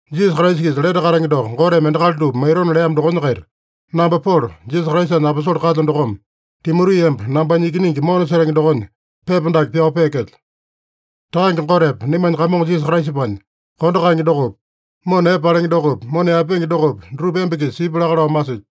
Jisasa Kraisa-kisa lete katenge doko Goteme endakali dupa maitona leamo dokonya-kaita namba Polo, Jisasa Kraisanya aposole kalyo dokome, Timoti emba nambanya ikiningi mona setenge dokonya pepa dake pyao peekelyo. Takange Gotepa naimanya Kamongo Jisasa Kraisapanya kondo kaenge dokopi, mona epe palenge dokopi, mona yaepenge dokopi, dutupa emba-kisa sipya laka lao masilyo.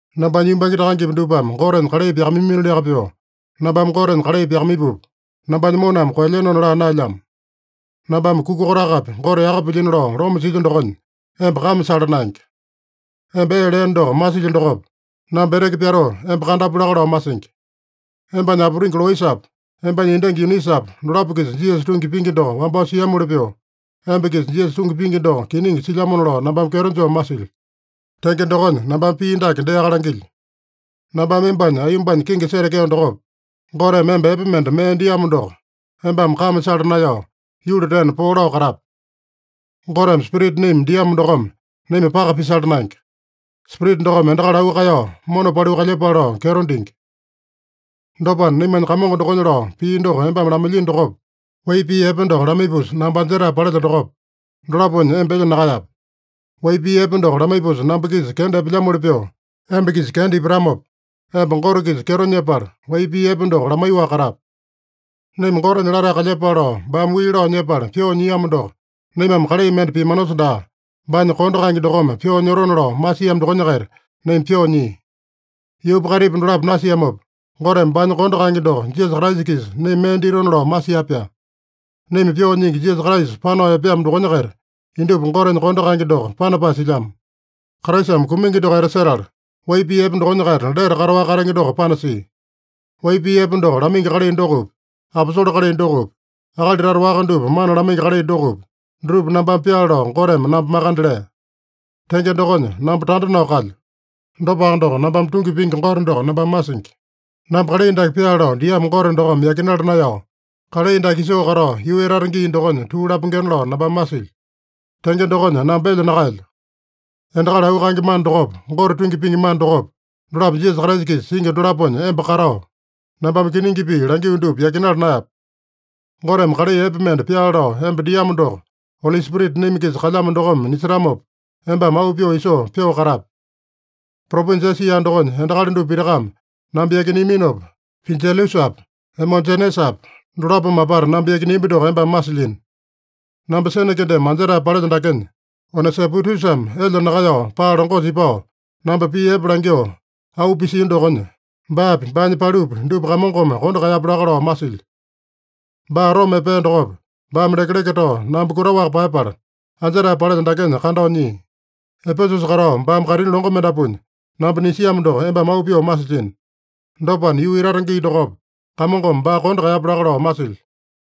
Nambanya yumbange takangepi dupame Gotenya kalai pyakamaiyamiliaka pyoo, nambame Gotenya kalai pyakamaipupa, nambanya moname koelyenona laa naelyamo. Nambame kuka kotakapi Gote yaka pilyino lao loma silyo dokonya, emba kame sala naenge. Emba ee leeno doko masilyo dokopa, namba eteke pyatoo, emba kandapu laka lao masingi. Embanya aputingi Loisapa, embanya endangi Yunisapa, dolapo-kisa Jisasa tungi pingi doko wambao siamoli pyoo, emba-kisa Jisasa tungi pingi doko kiningi silyamona lao nambame kyeto joo masilyo. Tenge dokonya, nambame pii dake deaka langilyo: Nambame embanya aiyombanya kingi setekeo dokopa, Goteme emba epe mende mee diamo doko embame kame sala naeyao, yuli tena poo lao katape. Goteme spirita naima diamo dokome naima paka pisala naenge. Spirita dokome endakali auu kaeyao, mona paliu kalyepale lao kyeto dingi. Dopana, naimanya Kamongo dokonya lao pii doko embame lamailyino dokopa, wai pii epe doko lamaipusa namba anjetae palelyo dokopa, dolaponya emba elya nakaeyape. Wai pii epe doko lamaipusa namba-kisa kenda epelyamoli pyoo emba-kisa kenda ipatamopa, emba Gote-kisa kyeto nyepala, wai pii epe doko lamaiyoaka katape. Naima Gotenya latae kalyepale lao baame wii lao nyepala pyoo nyiamo doko, naimame kalai mende piamanosa daa, baanya kondo kaenge dokome pyoo nyotona lao masiamo dokonya-kaita naima pyoo nyia. Yuupa kaitipa dolapo nasiamopa, Goteme baanya kondo kaenge doko Jisasa Kraisa-kisa naima mee ditona lao masia-pyaa. Naima Pyoo Nyingi, Jisasa Kraisa panao epeamo dokonya-kaita, indupa Gotenya kondo kaenge doko panapae silyamo. Kraisame kumingi doko etasetala, wai pii epe dokonya-kaita lete kataowaka katenge doko panasia. Wai pii epe doko lamaingi kalai dokopi, aposole kalai dokopi, akali tata waka dupa mana lamaingi kalai dokopi, dutupa nambame pyaale lao Goteme namba makande lea. Tenge dokonya, namba tanda nao kalyo. Dopaka doko, nambame tungi pingi Gote doko nambame masingi. Namba kalai dake pyaale lao diamo Gote dokome yakinala naeyao, kalai dake isoo katao yuu etata gii dokonya tuu lapengena lao nambame masilyo. Tenge dokonya, namba elya nakaelyo. Endakali auu kaenge mana dokopa, Gote tungi pingi mana dokopa, dolapo Jisasa Kraisa-kisa singi dolaponya emba katao, nambame kiningi pii langio dupa yakinala naeyape. Goteme kalai epe mende pyaale lao emba diamo doko Oli Spirita naima-kisa kalyamo dokome nisetamopa, embame auu pyoo isoo, pyoo katape. Propinja Esia dokonya endakali dupa pitakame namba yakineaminopa, Pijelusapa, Emojenesapa dolapome apata namba yakineambi doko embame masilyino. Namba sene kendeme anjetae palelyo dakenya, Onesipotusame elya nakaeyao paa longosa ipao, namba pii epe langyoo auu pisia dokonya, baapi, baanya palupi dupa Kamongome kondo kaeyapya laka lao masilyo. Baa Roma epea dokopa, baame lekeleke tao namba kutaowaka paeyapala, anjetae palelyo dakenya kandao nyia. Epesusa katao baame kaitini longo mendapuanya namba nisiamo doko embame auu pyoo masilyino. Dopana, yuu etata gii dokopa, Kamongome baa kondo kaeyapya laka lao masilyo.